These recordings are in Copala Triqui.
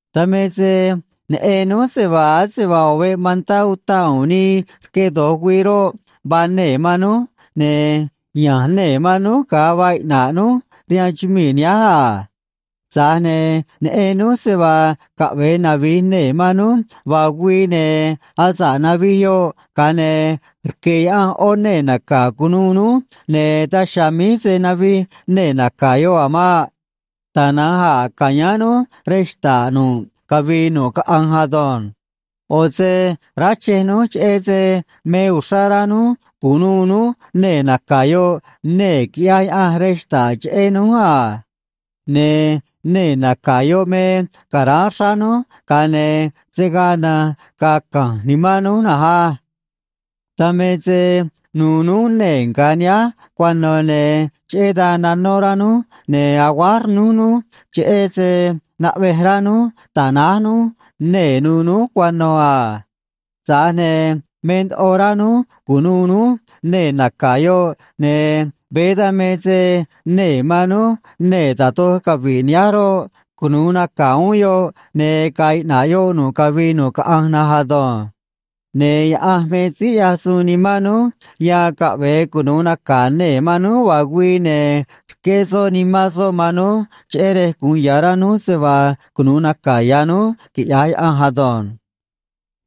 Dan me se neꞌen núj se vaa ase vaa ꞌo̱ veꞌ mantá utaꞌ u̱u̱n nii rque do̱j güii roꞌ, vaa nee̱ man núj, ne̱ ya̱nj nee̱ man núj ga̱a vaa iꞌna̱ꞌ núj rihaan chumii̱ nihánj a. Tza̱j ne̱ neꞌen núj se vaa caꞌve̱e navi̱j nee̱ man núj vaa güii, ne̱ asa̱ꞌ navij yoꞌ, ga̱a ne̱ rque̱ Yaꞌanj ꞌó nee̱ naca̱ cu̱nuû núj, ne̱ daj chiha̱a̱ míj se̱ navij nee̱ naca̱ yoꞌ a̱ maꞌ. Tana̱nj a̱ ca̱yáán núj rej xta̱ꞌ nu̱ꞌ cavii nu̱ꞌ caꞌanj ado̱nj. ꞌO̱ se ráchej núj, cheꞌé se me uxrá rá núj cu̱nuû núj nee̱ naca̱ yoꞌ, nee̱ quiꞌyaj Yaꞌanj rej xta̱ꞌ cheꞌé núj a. Ne̱ nee̱ naca̱ yoꞌ me ca̱ráán xráá núj, ga̱a ne̱ se̱ gaa na̱nj ga̱a̱ ca̱nj nimán núj na̱nj á. Dan me se nuû núj nee̱ nga̱ nihánj cuano̱, ne̱ cheꞌé dan nanó rá núj, ne̱ aguáj rnúj núj, cheꞌé se naꞌvej rá núj ta̱náj núj nee̱ nu̱u̱ núj cuano̱ a. Tza̱j ne̱ me ndoꞌo rá núj cu̱nuû núj nee̱ naca̱ yoꞌ, ne̱ veé dan me se nee̱ man núj nee̱ da̱j doj cavi̱ꞌ nihánj roꞌ, cunu̱u naca̱ uún yoꞌ, ne̱ ga̱a̱ iꞌna̱ꞌ yoꞌ nu̱ꞌ cavii nu̱ꞌ caꞌanj na̱nj ado̱nj. Ne̱ Yaꞌanj me síí ꞌyaj suun nimán núj yan caꞌve̱e cunu̱u naca̱ nee̱ man núj vaa güii, ne̱ rqué soꞌ Nimán soꞌ man núj, cheꞌé rej gu̱un ya̱ rá núj se vaa cunu̱u naca̱ ya̱ núj quiꞌya̱j Yaꞌanj ado̱nj.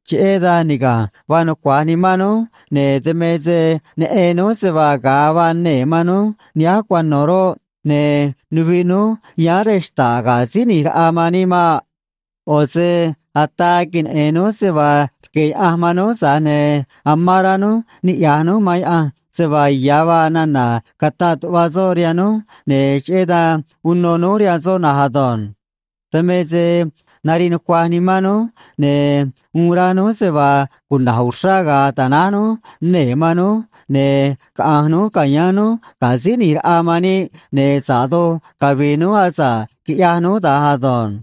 Cheꞌé dan niga̱nj vaa nucua̱j nimán núj, ne̱ dan me se neꞌen núj se vaa ga̱a vaa nee̱ man núj nihánj cuano̱ roꞌ, ne̱ nuviꞌ núj yáán rej xta̱ꞌ ga̱ Síí ꞌNi̱j Raꞌa man níꞌ maꞌ. ꞌO̱ se ataa queneꞌe̱n núj se vaa rque̱ Yaꞌanj man núj, tza̱j ne̱ amán rá núj niꞌya̱j núj man Yaꞌanj se vaa ya̱ vaa nana̱ cataꞌ tuꞌva soꞌ rihaan núj, ne̱ cheꞌé dan uno núj rihaan soꞌ na̱nj ado̱nj. Dan me se nariꞌ nucuaj nimán núj, ne̱ uun rá núj se vaa cuna̱j uxrá ga̱a̱ ta̱náj núj nee̱ man núj, ne̱ caꞌa̱nj núj ca̱yáán núj ga̱ Síí ꞌNi̱j Raꞌa man níꞌ, ne̱ sa̱ꞌ doj cavi̱i̱ núj asa̱ꞌ quiꞌyaj núj da̱nj ado̱nj.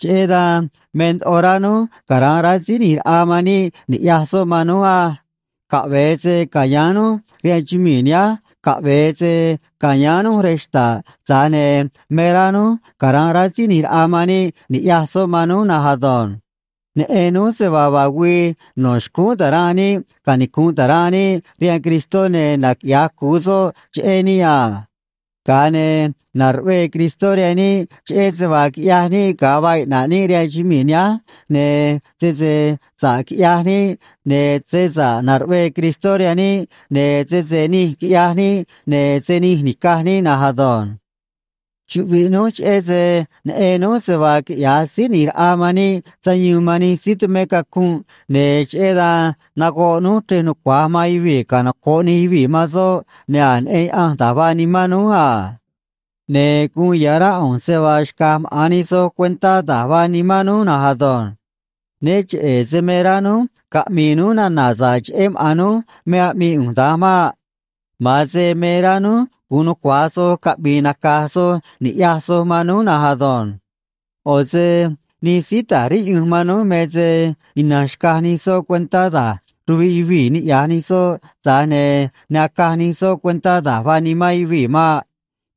Cheꞌé dan me ndoꞌo rá núj cara̱nꞌ rá Síí ꞌNi̱j Raꞌa man níꞌ ni̱ꞌyaj soꞌ man núj á. Caꞌve̱e se ca̱yáán núj rihaan chumii̱ nihánj, caꞌve̱e se ca̱yáán núj rej xta̱ꞌ, tza̱j ne̱ me rá núj cara̱nꞌ rá Síí ꞌNi̱j Raꞌa man níꞌ ni̱ꞌyaj soꞌ man núj na̱nj ado̱nj. Neꞌen núj se vaa vaa güii no̱ xcúún ta̱ranꞌ níꞌ canicu̱nꞌ ta̱ranꞌ níꞌ rihaan Cristó, ne̱ naquiꞌya̱j cu̱u soꞌ cheꞌé níꞌ a. Ga̱a ne̱ na̱ruꞌvee Cristó rihaan níꞌ cheꞌé se vaa quiꞌyaj níꞌ ga̱a vaa iꞌna̱ꞌ níꞌ rihaan chumii̱ nihánj, ne̱ sese sa̱ꞌ quiꞌyaj níꞌ, ne̱ se sa̱ꞌ na̱ruꞌvee Cristó rihaan níꞌ, ne̱ sese nij quiꞌyaj níꞌ, ne̱ se nij ni̱caj níꞌ na̱nj ado̱nj. Chuꞌviꞌ núj cheꞌé se neꞌen núj se vaa quiꞌya̱j Síí ꞌNi̱j Raꞌa man níꞌ sayuun man nij síí tumé cacunꞌ, ne̱ cheꞌé dan nagoꞌ núj chrej nucua̱j man yuvii̱ canoco̱ꞌ nij yuvii̱ man soꞌ, ne̱ a̱j neꞌen Yaꞌanj da̱j vaa nimán núj a. Ne̱ guun ya̱ rá ꞌu̱nj se vaa xca̱j maꞌa̱n nij soj cuentá da̱j vaa nimán núj na̱nj ado̱nj. Né cheꞌe̱ se me rá núj caꞌmi̱i̱ núj nana̱ sa̱ꞌ cheꞌé maꞌa̱n núj me aꞌmii ꞌu̱nj da̱nj maꞌ. Ma̱an se me rá núj gu̱un nucua̱j soj caꞌmi̱i̱ nacaj soj ni̱ꞌyaj soj man núj na̱nj ado̱nj. ꞌO̱ se nij síí ta̱j riꞌyunj man núj me se ina̱nj xcaj nij soꞌ cuentá da̱j ruviꞌ yuvii̱ niꞌya̱j nij soꞌ, tza̱j ne̱ ne acaj nij soꞌ cuentá da̱j vaa nimán yuvii̱ maꞌ.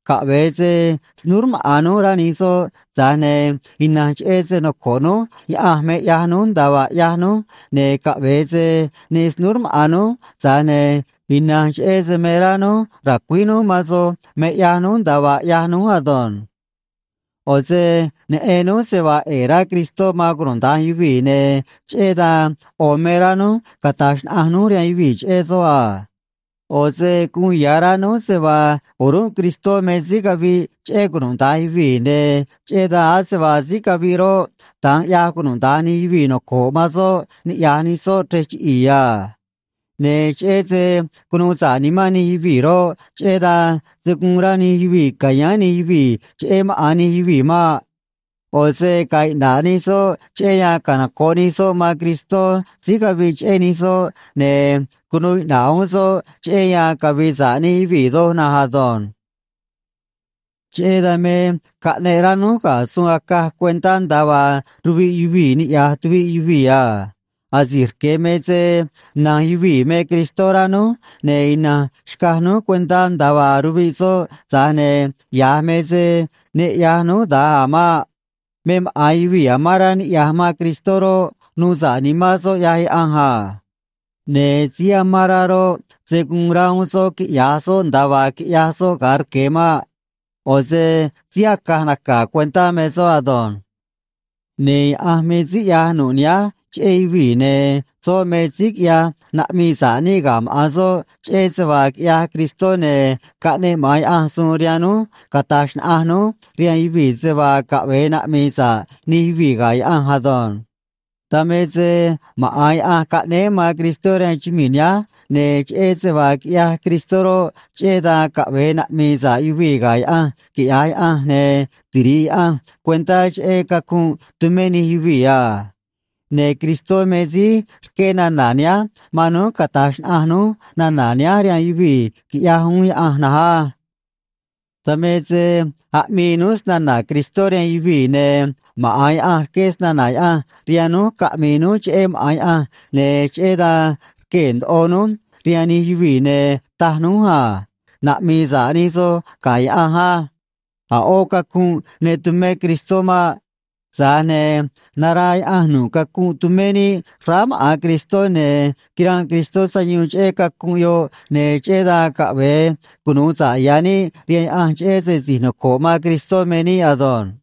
Caꞌve̱e se snúú rmaꞌa̱n núj rá nij soꞌ, tza̱j ne̱ ina̱nj cheꞌé se noco̱ꞌ núj Yaꞌanj me ꞌyaj núj nda̱a vaa ꞌyaj núj, ne̱ caꞌve̱e se ne snúú rmaꞌa̱n núj, tza̱j ne̱ ina̱nj cheꞌé se me rá núj ra̱cuíj núj man soj me ꞌyaj núj nda̱a vaa ꞌyaj núj ado̱nj. ꞌO̱ se neꞌen núj se vaa ꞌe̱e̱ rá Cristó man cunuda̱nj yuvii̱, ne̱ cheꞌé dan ꞌo̱ me rá núj cata̱j xnaꞌanj núj rihaan yuvii̱ cheꞌé soꞌ a. ꞌO̱ se guun ya̱ rá núj se vaa o̱rúnꞌ Cristó me síí caviꞌ cheꞌé cunuda̱nj yuvii̱, ne̱ cheꞌé dan ase vaa síí caviꞌ roꞌ, da̱nj ꞌyaj cunuda̱nj nij yuvii̱ noco̱ꞌ man soꞌ niꞌya̱j nij soꞌ chrej chiꞌi̱i̱ a. Ne̱ cheꞌé se cunuu sa̱ꞌ nimán nij yuvii̱ roꞌ, cheꞌé dan se̱ guun rá nij yuvii̱ ca̱yáán nij yuvii̱ cheꞌé maꞌa̱n nij yuvii̱ maꞌ. ꞌO̱ se ga̱a̱ iꞌna̱ꞌ nij soꞌ cheꞌé yan canoco̱ꞌ nij soꞌ man Cristó síí caviꞌ cheꞌé nij soꞌ, ne̱ cunuu iꞌna̱ꞌ uún soꞌ cheꞌé yan cavi̱i̱ sa̱ꞌ nij yuvii̱ doj na̱nj ado̱nj. Cheꞌé dan me caꞌneꞌ rá núj ga̱ suun acaj cuentá nda̱a vaa ruviꞌ yuvii̱ niꞌya̱j tuviꞌ yuvii̱ a. Asi̱j rque̱ me se na̱nj yuvii̱ me Cristó rá núj, ne̱ ina̱nj xcaj núj cuentá nda̱a vaa ruviꞌ soꞌ, tza̱j ne̱ ya̱j me se ne ꞌyaj núj da̱nj a̱ maꞌ. Me maꞌa̱n yuvii̱ amán rá niꞌya̱j man Cristó roꞌ, nuu sa̱ꞌ nimán soꞌ ꞌyaj Yaꞌanj a. Ne̱ síí amán rá roꞌ, se̱ guun rá uún soꞌ quiꞌya̱j soꞌ nda̱a vaa quiꞌyaj soꞌ ga̱a rque̱ maꞌ. ꞌO̱ se síí acaj naca̱ cuentá me soꞌ ado̱nj. Ne̱ Yaꞌanj me síí ꞌyaj nu̱ꞌ nihánj cheꞌé yuvii̱, ne̱ soꞌ me síí quiꞌyaj naꞌmii sa̱ꞌ níꞌ ga̱ maꞌa̱n soꞌ cheꞌé se vaa quiꞌyaj Cristó, ne̱ caꞌneꞌ maꞌa̱n Yaꞌanj suun rihaan núj cata̱j xnaꞌanj núj rihaan yuvii̱ se vaa caꞌve̱e naꞌmi̱i̱ sa̱ꞌ nij yuvii̱ ga̱ Yaꞌanj ado̱nj. Dan me se maꞌa̱n Yaꞌanj caꞌnéé man Cristó rihaan chumii̱ nihánj, ne̱ cheꞌé se vaa quiꞌyaj Cristó roꞌ, cheꞌé dan caꞌve̱e naꞌmi̱i̱ sa̱ꞌ yuvii̱ ga̱ Yaꞌanj, quiꞌya̱j Yaꞌanj, ne̱ tiri̱ꞌ Yaꞌanj cuentá cheꞌé cacunꞌ tumé nij yuvii̱ a. Ne̱ Cristó me síí rqué nana̱ nihánj man núj cata̱j xnaꞌanj núj nana̱ nihánj rihaan yuvii̱, quiꞌyaj uún Yaꞌanj na̱nj á. Dan me se aꞌmii núj snana̱ Cristó rihaan yuvii̱, ne̱ maꞌa̱n Yaꞌanj rqué snana̱ Yaꞌanj rihaan núj caꞌmi̱i̱ núj cheꞌé maꞌa̱n Yaꞌanj, ne̱ cheꞌé dan rquee̱ ndoꞌo núj rihaan nij yuvii̱, ne̱ taj núj a: “Naꞌmi̱i̱ sa̱ꞌ nij soj ga̱ Yaꞌanj á.” A̱ ꞌó cacunꞌ ne tumé Cristó maꞌ. Tza̱j ne̱ naraa Yaꞌanj nu̱ꞌ cacunꞌ tumé níꞌ xráá maꞌa̱n Cristó, ne̱ quiranꞌ Cristó sayuun cheꞌé cacunꞌ yoꞌ, ne̱ cheꞌé dan caꞌve̱e cunu̱u sa̱ꞌ ya̱ níꞌ rihaan Yaꞌanj cheꞌé se si̱j noco̱ꞌ man Cristó me níꞌ ado̱nj.